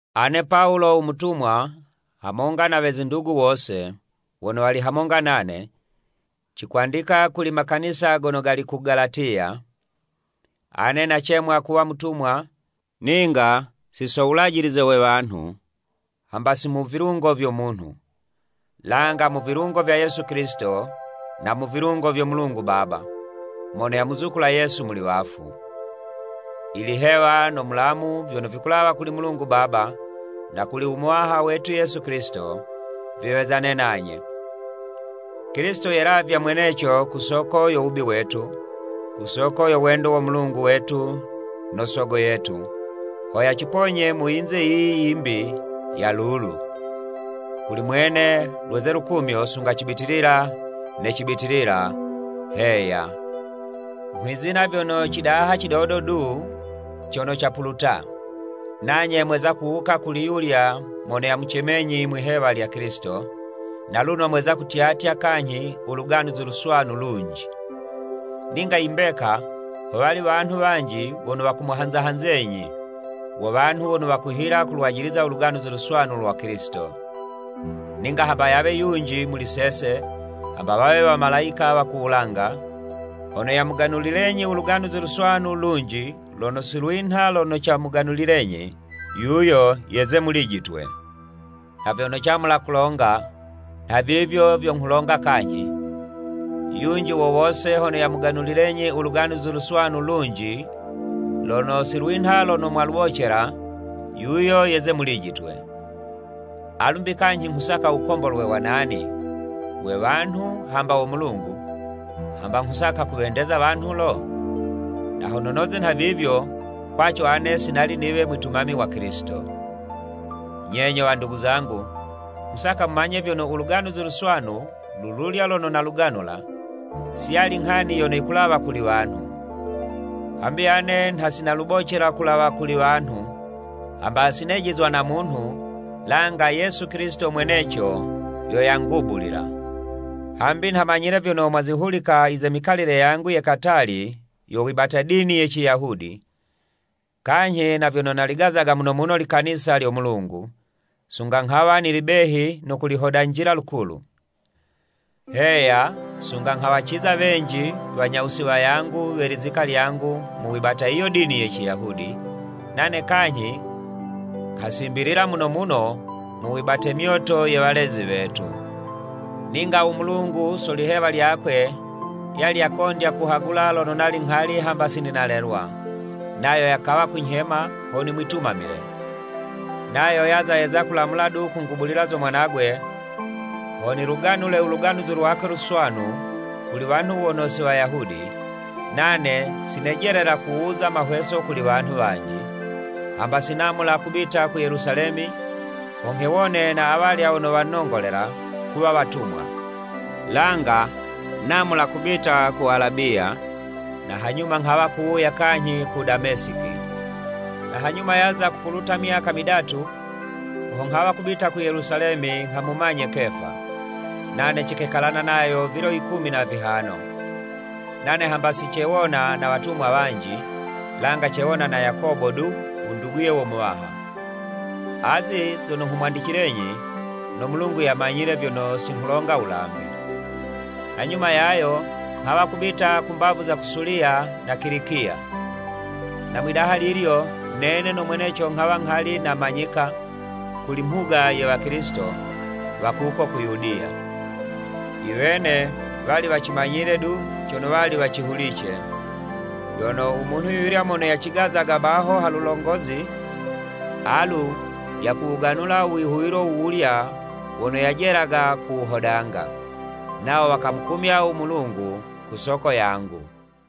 Ane Pawulo u mutumwa, hamonga na we zindugu wose, wono wali hamonga nane, cikwandika kuli makanisa gono gali ku Galatiya. Ane nacemwa kuwa mutumwa, ninga si so wulajilize we wanhu, hamba si mu vilungo vyo munhu, langa mu vilungo vya Yesu Kilisito, na mu vilungo vyo Mulungu Baba, mono yamuzukula Yesu muli wafu. Ilihewa no mulamu vyono vikulawa kuli Mulungu Baba, na kuli u Muwaha wetu Yesu Kilisito, viwezane nanye. Kilisito yelavya mweneco ku soko yo wubi wetu, ku soko yo wendo wo Mulungu wetu no Sogo yetu, ho yaciponye mu yinze yiyi yimbi ya lulu. Kuli mwene lweze lukumyo sunga cibitilila ne cibitilila. Heya Nghwizina vyono cidaha cidodo du cono capuluta, nanye mweza kuwuka kuli yulya mono yamucemenyi mwi'hewa lya Kilisito, na luno mweza kutyatya kanyhi u Luganuzi Luswanu lunji. Ninga i mbeka, howali wanhu wanji wono wakumuhanza-hanzenyi, wo wanhu wono wakuhila kulwajiliza u Luganuzi Luswanu lwa Kilisito. Ninga hamba yawe yunji muli sese, hamba wawe Wamalayika wa ku wulanga, hono yamuganulilenyi u Luganuzi Luswanu lunji lono si lwinha lono camuganulilenyi, yuyo yeze mulijitwe! Nha vyono camula kulonga, nhavivyo vyo nghulonga kanyhi, yunji wo wose hono yamuganulilenyi u Luganuzi Luswanu lunji lono si lwinha lono mwalubocela, yuyo yeze mulijitwe! Alu'mbi kanyhi nghusaka wukombolwe wa nani, we wanhu hamba wo Mulungu? Hamba nghusaka kuwendeza wanhu lo? Na hono noze nhavivyo, kwaco, ane si nali niwe mwitumami wa Kilisito. Nye nyo wandugu zangu, nghusaka mumanye vyono u Luganuzi Luswanu lululya lono naluganula, si yali nghani yono yikulawa kuli wanhu. Hambi ane nha si nalubocela kulawa kuli wanhu, hamba si nejizwa na munhu, langa Yesu Kilisito mweneco yo yangubulila. Hambi nha manyile vyono, mwazihulika i ze mikalile yangu ye katali yo wibata dini ye Ciyahudi, kanyhi na vyono naligazaga muno muno likanisa lyo Mulungu, sunga nghawa nili behi no kulihodanjila lukulu. Heya, sunga nghawaciza wenji wanyawusi wayangu we lizika lyangu mu wibata yiyo dini ye Ciyahudi, nane kanyhi nghasimbilila muno muno mu wibate myoto ye walezi wetu. Ninga u Mulungu, so lihewa lyakwe, yali yakondya kuhagula lono nali nghali hamba si nalelwa, nayo yakawa kunyhema ho nimwitumamile. Nayo yaza yeza kulamula du kungubulila zo Mwanagwe, ho niluganule u Luganuzi lwakwe Luswanu kuli wanhu wono si Wayahudi, nane si nejelela kuwuza mahweso kuli wanhu wanji, hamba si namula kubita ku Yelusalemi ho nghewone na awalya wono wanongolela kuwa watumwa, langa namula kubita ku Alabiya, na hanyuma nghawa kuwuya kanyhi ku Damesiki. Na hanyuma yaza kupuluta myaka midatu, ho nghawa kubita ku Yelusalemi nghamumanye Kefa, nane cikekalana nayo vilo yikumi na vihano. Nane hamba sicewona na watumwa wanji, langa cewona na Yakobo du u nduguye wo Muwaha. Azi zono nghumwandicilenyi, no Mulungu yamanyile vyono si nghulonga wulambi. Hanyuma yayo nghawa kubita ku mbavu za ku Suliya na Kilikiya. Na mwi'daha lilyo, nene no mweneco nghawa nghali namanyika kuli mhuga ye Wakilisito wa kuko ku Yudiya. I wene wali wacimanyile du cono wali wacihulice, vyono, “U munhu yuyulya mono yacigazaga baho ha lulongozi, alu yakuwuganula u wihuwilo wuwulya wono yajelaga kuwuhodanga.” Nawo wakamukumya u Mulungu ku soko yangu.